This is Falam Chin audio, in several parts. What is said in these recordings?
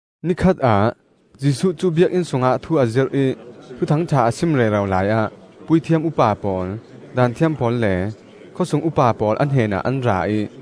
Nikhat ah Jesuh cu Biakinn sungah thu a zirh ih Thuthangṭha a sim rero laiah puithiam upa pawl, Daanthiam pawl le khawsung upa pawl a hnenah an ra ih,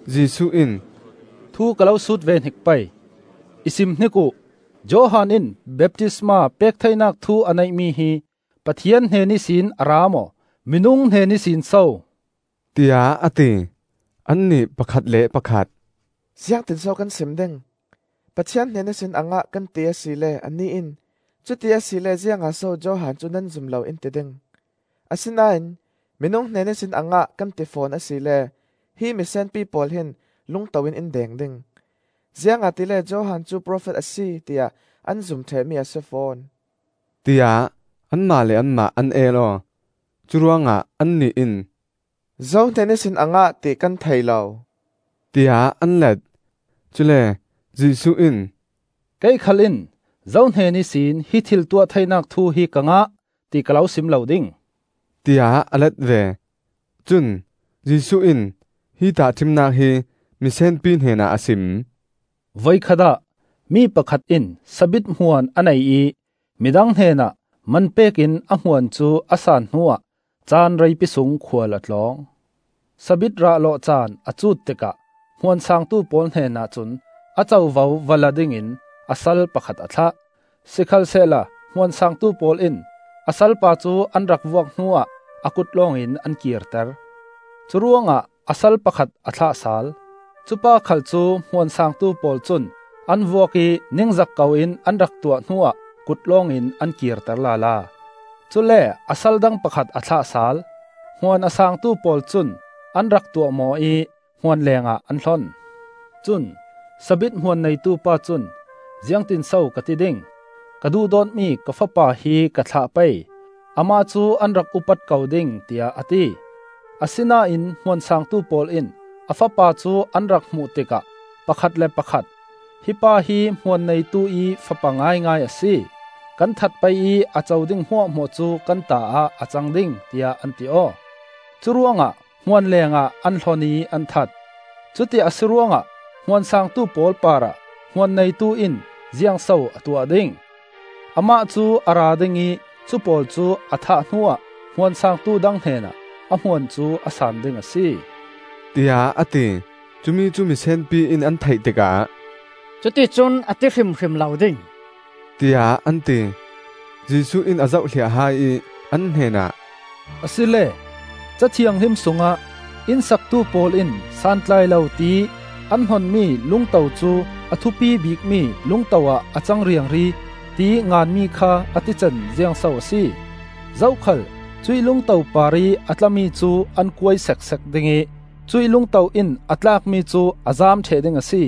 Jesuh in, “Thu ka lo sut ve hnik pei. I simhnik uh. Johan in baptisma pek theinak thu a neihmi hi Pathian hnen ihsin a ra maw, minung hnen ihsin so?” tiah a ti. Annih pakhat le pakhat, “Ziangtin so kan sim ding? ‘Pathian hnen ihsin a ngah,’ kan ti asile anih in, ‘Cuti asile ziangah so Johan cu nan zum lo?’ in ti ding. Asinain ‘Minung hnen ihsin a ngah,’ kan ti fawn asile hi misenpi pawl hin lungto in in deng ding, ziangahtile Johan cu profet a si tiah an zum ṭhehmi a si fawn,” tiah anmah le anmah an el aw. Curuangah annih in, “Zo hnen ihsin a ngah ti kan thei lo,” tiah an let. Cule Jesuh in, “Kei khal in zo hnen ihsin hi thil tuah theinak thu hi ka ngah, ti ka lo sim lo ding,” tiah a let ve. Cun Jesuh in hi tahṭhimnak hi misenpi hnenah a sim: “Voikhat ah mi pakhat in sabit hmuan a nei ih midang hnenah man pek in a hmuan cu a san hnuah caan reipi sung khual a tlawng. Sabit rah lawh caan a cut tikah hmuan saangtu pawl hnenah cun a covo va la dingin a sal pakhat a thlah. Sikhalsehla hmuan saangtu pawl in a salpa cu an rak vuak hnuah a kut lawngin an kirter. Curuangah a sal pakhat a thlah sal; cupa khal cu hmuan saangtu pawl cun an vuak ih ningzak koin an rak tuah hnuah kut lawngin an kirter lala. Cule a sal dang pakhat a thlah sal. Hmuan a saangtu pawl cun an rak tuahmawh ih hmuan lengah an hlon. Cun sabit hmuan neitu pa cun, ‘Ziangtin so ka ti ding? Ka duhdawtmi ka fapa hi ka thlah pei; amah cu an rak upat ko ding,’ tiah a ti. Asinain hmuan saangtu pawl in a fapa cu an rak hmuh tikah pakhat le pakhat, ‘Hi pa hi hmuan neituih fapa ngaingai a si. Kan that pei ih a co ding hmuahhmuah cu kan ta ah a cang ding!’ tiah an ti aw. Curuangah hmuan leengah an hlon ih an that. “Cuti a si ruangah hmuan saangtu pawl parah hmuan neitu in ziangso a tuah ding? Amah cu a ra ding ih cupawl cu a thah hnuah hmuan saangtu dang hnenah a hmuan cu a saan ding a si,” tiah a ti. Cumi cu misenpi in an theih tikah, “Cuticun a ti hrimhrim lo ding,” tiah an ti. Jesuh in a zohhliah hai ih an hnenah, “Asile, Ca Thianghlim sungah ‘Inn saktu pawl in santlai lo ti ih an hnonmi lungto cu a thupi bikmi lungto ah a cang riangri,’ tiih nganmi kha a tican ziangso a si? Zokhal cuih lungto parih a tlami cu an kuai seksek ding ih cuih lungto in a tlakmi cu a zaam ṭheh ding a si,”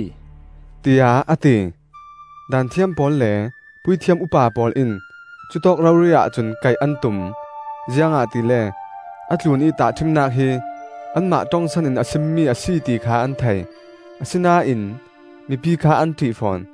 tiah a ti. Daanthiam pawl le puithiam upa pawl in cutawk rori ahcun kaih an tum, ziangahtile a tlunih tahṭhimnak hi anmah ṭongsan in a simmi a si, ti kha an thei; asinain mipi kha an ṭih fawn.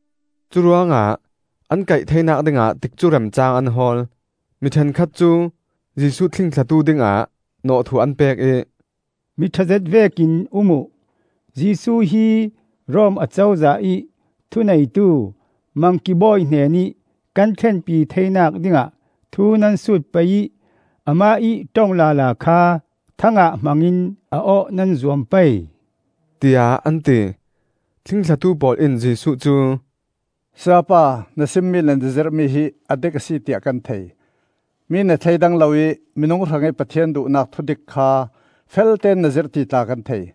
Curuangah an kaih theinak dingah tikcu remcaang an hawl. Mi ṭhenkhat cu Jesuh thlingthlatu dingah nawhthuh an pek ih, “Mi ṭhazet vekin um uh. Jesuh hi Rom Acozah ih thu neitu Mangki bawi hnenih kan thlenpi theinak dingah thu nan sut pei ih amah ih ṭong lala kha thang ah hmangin a awh nan zuam pei,” tiah an ti. Thlingthlatu pawl in Jesuh cu, “Sayapa, na simmi le na zirhmi hi a dik a si tiah kan thei. Mi na thleidang lo ih minung hrangih Pathian duhnak thudik kha felteón na zirh ti tla kan thei.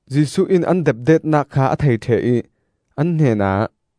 Jesuh in an depdetnak kha a thei ṭheh ih an hnenah,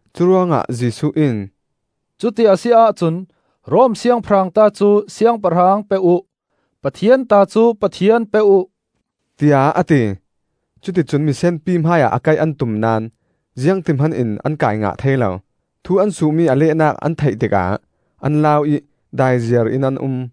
Curuangah Jesuh in, “Cuti a si ahcun Rom Siangpahrang ta cu siangpahrang pe uh; Pathian ta cu Pathian pe uh,” tiah a ti. Cuti cun misenpi hmaiah a kaih an tum naón ziangti hmanin an kai ngah thei lo; thu an suhmi a lehnak an theih tikah an lau ih daiziar in an um.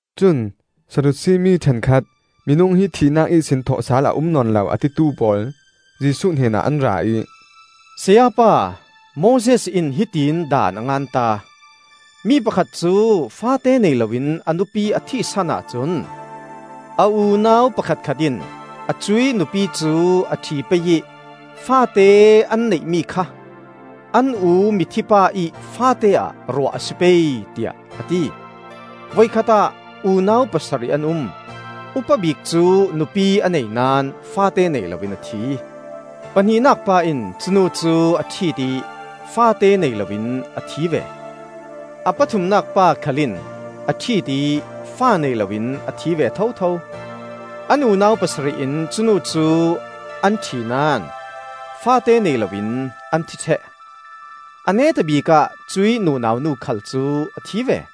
Cun Sadusi mi ṭhenkhat, minung hi thihnak ihsin thawhsal a um nawn lo, a titu pawl Jesuh hnenah an ra ih, “Sayapa, Moses in hiti in daan a nganta: ‘Mi pakhat cu faate nei loin a nupi a thihsan ahcun a unau pakhatkhat in a cuih nupi cu a ṭhi pei ih faate an neihmi kha an u mithi pa ih faate-ah ruah a si pei,’ tiah a ti. Voikhat ah unau pasarih an um. Upabik cu nupi a nei naón faate nei loin a thi. Pahnihnak pa in cunu cu a ṭhit ih faate nei loin a thi ve. A pathumnak pa khal in a ṭhit ih fa nei loin a thi ve thotho. An unau pasarih in cu nu cu an ṭhinaón faate nei loin an thi ṭheh. A neta bikah cuih nunau nu khal cu a thi ve.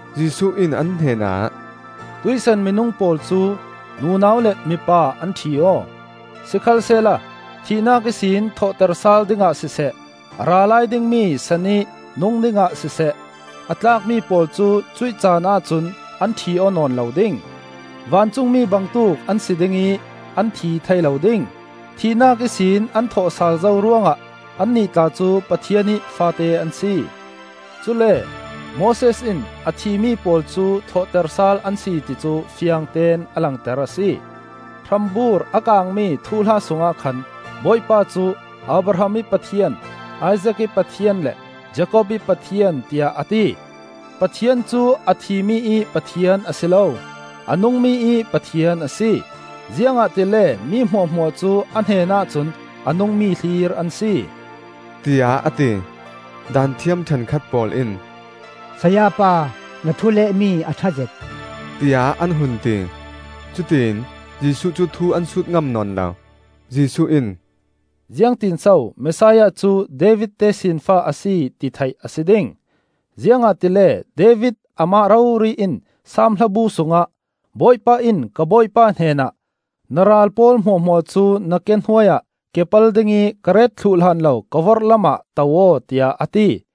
Jesuh in an hnenah, “Tuihsan minung pawl cu nunau le mipa an ṭhi aw. Sikhalsehla thihnak ihsin thawhter sal dingah siseh, a ra lai dingmi san ih nung dingah siseh, a tlakmi pawl cu cuih caan ahcun an ṭhi aw nawn lo ding. Vancungmi bangtuk an si ding ih an thi thei lo ding. Thihnak ihsin an thawhsal zo ruangah annih tla cu Pathian ih faate an si. Cule Moses in, a thimi pawl cu thawhter sal an si ti cu fiangteón a langter a si. Hrambur a kaangmi thuhla sungah khan Bawipa cu ‘Abraham ih Pathian, Isaak ih Pathian, le Jakob ih Pathian,’ tiah a ti. Pathian cu a thimi ih Pathian a si lo, a nungmi ih Pathian a si; ziangahtile mi hmuahhmuah cu a hnenah cun a nungmi hlir an si,” tiah a ti. Daanthiam ṭhenkhat pawl in, “Sayapa, na thu lehmi a ṭha zet!” tiah an hun ti. Cutiin Jesuh cu thu an sut ngam nawn lo. Jesuh in, “Ziangtin so Messiah cu David tesinfa a si, ti theih a si ding? Ziangahtile David amah rori in Saam Hlabu sungah, ‘Bawipa in ka Bawipa hnenah, Na ral pawl hmuahhmuah cu na ke hnuaiah, Ke pal dingih ka ret thluh hlan lo ka vorhlam ah to aw,’ tiah a ti.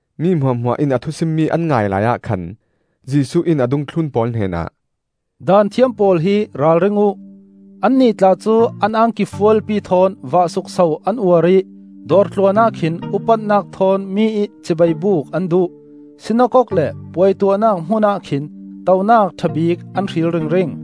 Mi hmuahhmuah in a thusimmi an ngai laiah khan Jesuh in a dungthlun pawl hnenah, “Daanthiam pawl hi ralring uh! Annih tla cu an angki fualpi thawn vah sukso an uar ih dawrtluan ah khin upatnak thawn mi ih cibaibuk an duh; sinakok le puai tuahnak hmun ah khin tonak ṭhabik an hril ringring.